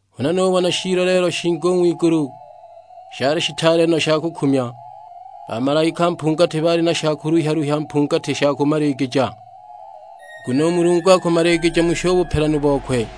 Huna nubona shiiloleelo shingi u ng'wigulu, shali shitaale no sha kukumya. Bamalaika mpungati baali na sha kuluhya-luhya mpungati sha kumaligija; nguno u Mulungu akumaligija musho u bupelanu bokwe.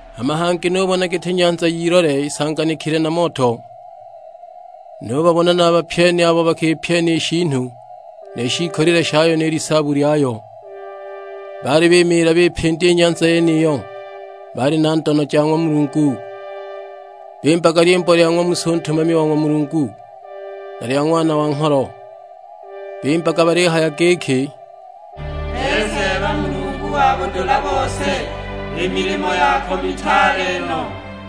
Hama hangi nubona giti nyanza y'ilole isanganikile na moto; nubabona na a bapyeni abo bakipyena i shiinu ni shiikolile shayo ni lisaabu lyayo; baali bimiila bipindya i nyanza yeniyo, bali na ndono ja ng'wa Mulungu. Bimbaga lyimbo lya ng'wa Musa u ntumami wa ng'wa Mulungu, na lya Ng'wana wa Ngholo. Bimbaga balihaya giki, "Ee Seeba Mulungu wa budula bose, i milimo yako mitaale no,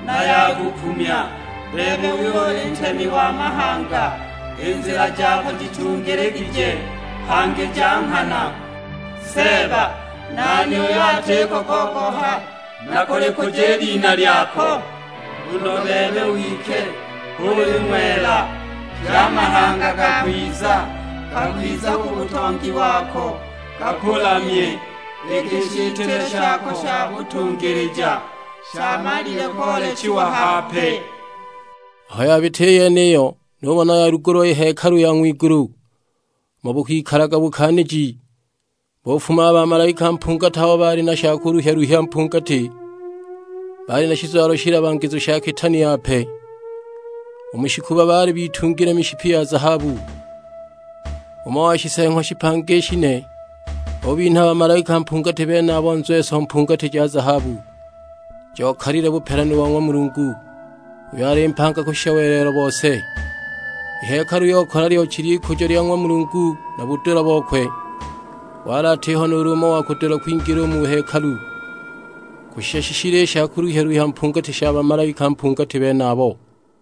na ya kukumya. Bebe uyo uli Ntemi wa mahanga, i nzila jako jitungiligije, hangi ja nghana. Seeba, nani uyo atiko kogoha na kulikuja i lina lyako? Nguno bebe wike h'uli ng'wela, pye a mahanga gakwiza, gakwiza ku butongi wako gakulamye, iki i shitile shako sha butungilija shamalile koolechiwa hape!" Aho yabita i yeniyo nubona yalugulwa i hekalu ya ng'wigulu, umo bukikalaga bukaaniji. Bufuma a bamalaika mpungati abo baali na sha kuluhya-luhya mpungati; baali na shizwalo shilabagizu sha kitaani yape; u mu shikuba baali bitungile mishipi ya zahabu. Umo wa Shiseeng'wa shipanga i shine ubinha a bamalaika mpungati benabo nzweso mpungati ja zahabu; jokalile bupelanu bo ng'wa Mulungu, uyo ali mpanga kushisha welelo bose. I hekalu yokala lyochi ly'ikujo lya ng'wa Mulungu na budula bokwe; wali atiho nuulu umo wa kudula kwingila u mu hekalu, kushisha shishile i sha kuluhya-luhya mpungati sha bamalaika mpungati benabo.